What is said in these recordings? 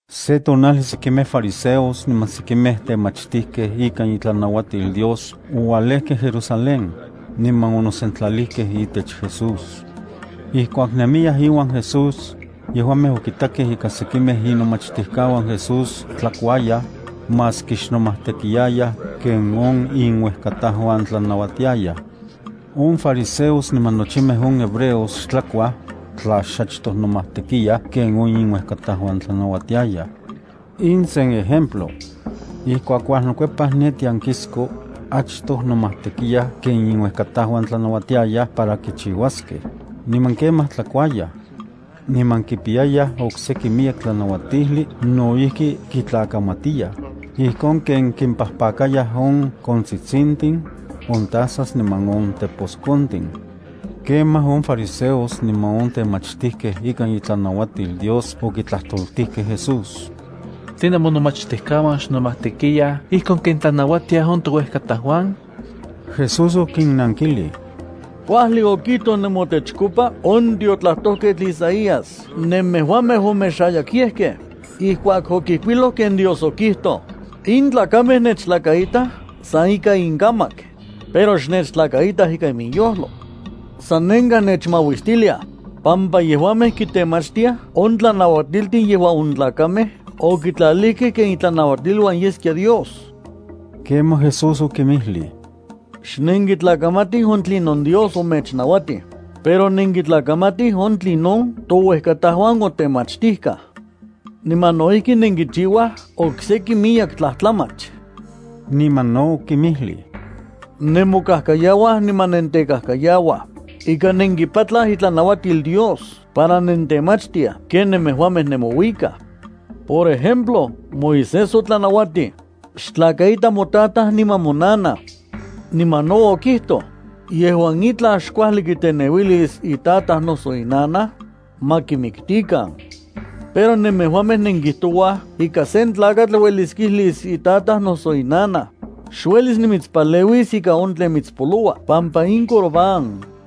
Se tonajli sekimej fariseos niman sekimej temachtijkej ikan itlanauatil Dios oualejkej Jerusalén, niman onosentlalijkej itech Jesús. Ijkuak nemiyaj iuan Jesús, yejuamej okitakej ika sekimej inomachtijkauan Jesús tlakuayaj, maski xnomajtekiyayaj ken on inuejkatajuan tlanauatiayaj. (On fariseos niman nochimej on hebreos xtlakuaj, tla xachtoj nomajtekiyaj ken on inuejkatauan tlanauatiayaj. In sen ejemplo. Ijkuak uajnokuepaj ne tiankisko, achtoj nomajtekiyaj ken inuejkatauan tlanauatiayaj para kichiuaskej, niman kemaj tlakuayaj. Niman kipiyayaj okseki miyek tlanauatijli no ijki kitlakamatiyaj, ijkon kenon kimpajpakayaj on kontsitsintin, on tazas niman on teposkontin.) Kemaj on fariseos niman on temachtijkej ikan itlanauatil Dios okitlajtoltijkej Jesús: —¿Tline monomachtijkauan xnomajtekiyaj ijkon ken tlanauatiaj on touejkatajuan? Jesús okinnankilij: —Kuajli okijtoj nemotechkopa on tiotlajtojketl Isaías nemejuamej omexayakyejkej, ijkuak okijkuiloj ken Dios okijtoj: In tlakamej nechtlakaitaj san ika inkamak, pero xnechtlakaitaj ikan inyojlo. Sanenkaj nechmauistiliaj, pampa yejuamej kitemachtiaj on tlanauatiltin yejuan on tlakamej okitlalijkej ken itlanauatiluan yeskia Dios. Kemaj Jesús okinmijlij: —Xnenkitlakamatij on tlinon Dios omechnauatij, pero nenkitlakamatij on tlinon touejkatajuan otemachtijkaj. Niman no ijki nenkichiuaj okseki miyek tlajtlamach. Niman no okinmijlij: —Nemokajkayauaj niman nentekajkayauaj, ika nenkipatlaj itlanauatil Dios para nentemachtiaj ken nemejuamej nemouikaj. Por ejemplo, Moisés otlanauatij: “Xtlakaita motataj niman monanaj.” Niman no okijtoj: “Yejuan itlaj xkuajli kiteneuilis itataj noso inanaj, ma kimiktikan.” Pero nemejuamej nenkijtouaj ika sen tlakatl uelis kijlis itataj noso inanaj: “Xuelis nimitspaleuis ika on tlen mitspoloua pampa in Corbán.”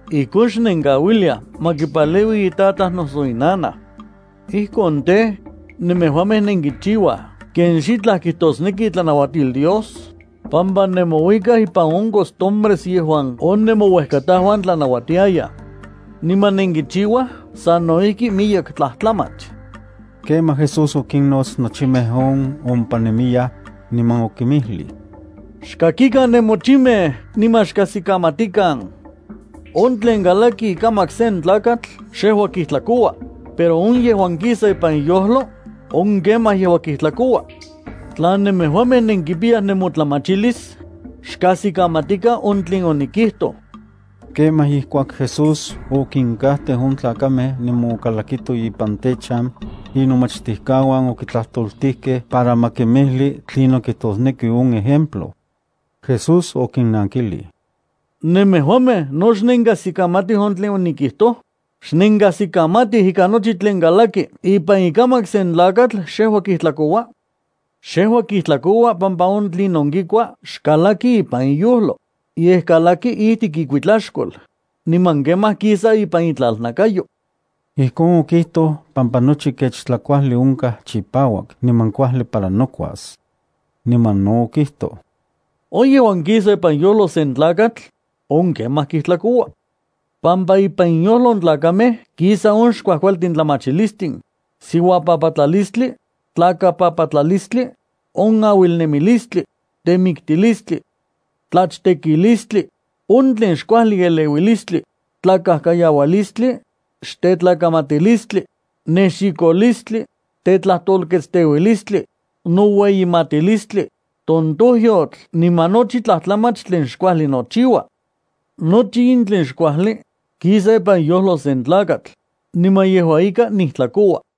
Ijkon xnenkauiliaj ma kipaleui itataj noso inanaj. Ijkon tej, nemejuamej nenkichiuaj ken xitlaj kijtosneki itlanauatil Dios, pampa nemouikaj ipan on costumbres yejuan on nemouejkatajuan tlanauatiyayaj. Niman nenkichiuaj sano ijki miyek tlajtlamach. Kemaj Jesús okinnots nochimej on ompa nemiyaj, niman okinmijlij: —Xkakikan nemochimej niman xkajsikamatikan. On tlen kalaki ikamak sen tlakatl xejua kijtlakoua, pero on yejuan kisa ipan iyojlo, on kemaj yejua kijtlakoua. Tla nemejuamej nenkipiyaj nemotlamachilis, xkajsikamatikan on tlen onikijtoj. Kemaj ijkuak Jesús okinkajteu on tlakamej niman okalakito ipan techan, inomachtijkauan okitlajtoltijkej para ma kimijli tlinon kijtosneki on ejemplo. Jesús okinnankilij: —¿Nemejuamej no xnenkajsikamatij on tlinon onikijtoj? ¿Xnenkajsikamatij ika nochi tlen kalaki ipan ikamak sen tlakatl xejua kijtlakoua? Xejua kijtlakoua pampa on tlinon kikua xkalaki ipan iyojlo, yej kalaki ijtik ikuitlaxkol, niman kemaj kisa ipan itlalnakayo. Ijkon okijtoj pampa nochi kech tlakuajli onkaj chipauak niman kuajli para nokuas. Niman no okijtoj: —On yejuan kisa ipan iyojlo sen tlakatl, on kemaj kijtlakoua, pampa ipan inyojlo on tlakamej kisa on xkuajkualtin tlamachilistin, siuapapatlalistli, tlakapapatlalistli, on auilnemilistli, temiktilistli, tlachtekilistli, on tlen xkuajli eleuilistli, tlakajkayaualistli, xtetlakamatilistli, nexikolistli, tetlajtolketsteualistli, noueyimatilistli, tojtonyotl niman nochi tlamach tlen xkuajli nochiua. Nochi in tlen xkuajli, kisa ipan iyojlo sen tlakatl, niman yejua ika nijtlakoua.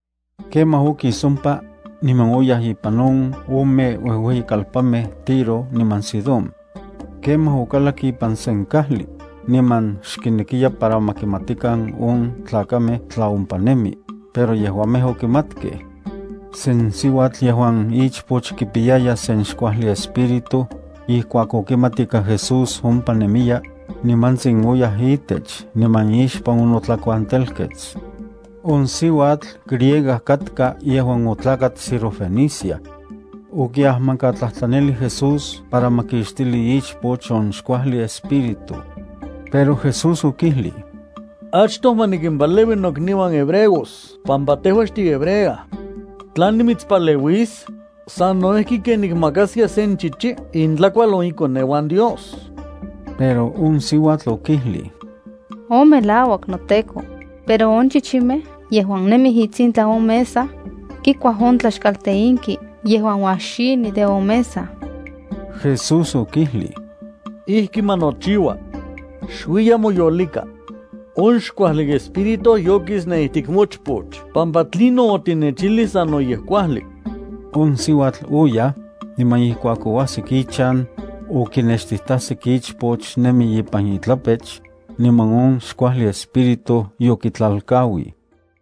Kemaj okis ompa, niman oyaj ipan on ome uejueyikalpanmej Tiro niman Sidón. Kemaj okalak ipan sen kajli, niman xkinekiya para ma kimatikan on tlakamej tla ompa nemi, pero yejuamej okimatkej. Sen siuatl yejuan ichpoch kipiyaya sen xkuajli espíritu, ijkuak okimat ika Jesús ompa nemiya, nimantsin oyaj itech niman ixpan onotlakuantelkets. On siuatl griega katka yejuan otlakat Sirofenicia. Okiajmankatlajtlanilij Jesús para ma kixtili ichpoch on xkuajli espíritu. Pero Jesús okijlij: —Achtoj ma nikimpaleui nokniuan hebreos pampa tejua xtihebrea. Tla nimitspaleuis, sano ijki ken nikmakaskia sen chichi intlakual on ikoneuan Dios. Pero on siuatl okijlij: —On melauak, noTEKO, pero on chichimej yejuan nemij itsintlan on mesa, kikuaj on tlaxkalteinki yejuan uajxini de on mesa. Jesús okijlij: —Ijki ma nochiua. Xuiya moyolika. On xkuajli espíritu yokis ne ijtik mochpoch pampa tlinon otinechijlij sanoyej kuajli. On siuatl oyaj, niman ijkuak oajsik ichan, okinextijtajsik ichpoch nemi ipan itlapech, niman on xkuajli espíritu yokitlalkauij.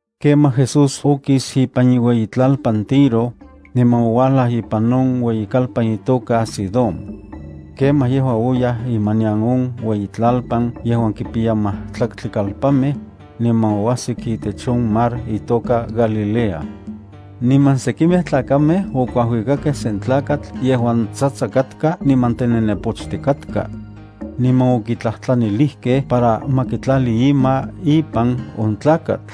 Kemaj Jesús okis ipan iueyitlalpan Tiro, niman ouajlaj ipan on ueyikalpan itoka Sidón. Kemaj yejua oyaj imanian on iueyitlalpan yejuan kipiya majtlaktli kalpanmej, niman oajsik itech on mar itoka Galilea. Niman sekimej tlakamej okuajuikakej sen tlakatl yejuan tsatsa katka niman tenenepochtik katka. Niman okitlajtlanilijkej para ma kitlali ima ipan on tlakatl.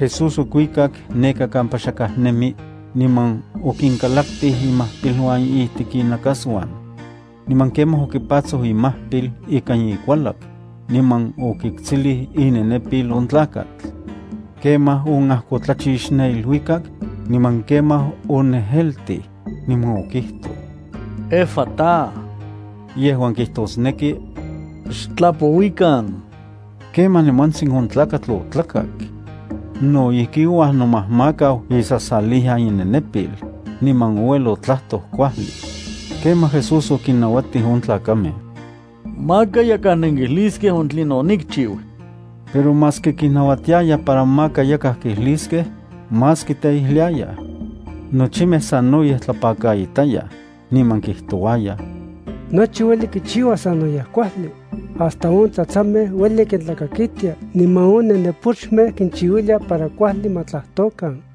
Jesús okuikak neka kampa xakaj nemi, niman okinkalaktij imajpiluan ijtik inakasuan. Niman kemaj okipatsoj imajpil ikan ikualak, niman okiktsilij inenepil on tlakatl. Kemaj onajkotlachix ne iluikak, niman kemaj onejeltij, niman okijtoj: —¡Efatá! —yejuan kijtosneki: ¡Xtlapouikan! Kemaj nimantsin on tlakatl otlakak. No ijki ouajnomajmakau isasaliyan inenepil, niman ouel otlajtoj kuajli. Kemaj Jesús okinnauatij on tlakamej: —Maka yakaj nenkijliskej on tlinon onikchiu. Pero maski kinnauatiaya para maka yakaj kijliskej, más kiteijliayaj. Nochimej sanoyej tlapakaitayaj, niman kijtouayaj: —¡Nochi ueli kichiua sanoyej kuajli hasta on tsatsamej ueli kintlakakitia, niman on nenepochmej kinchiuilia para kuajli ma tlajtokan!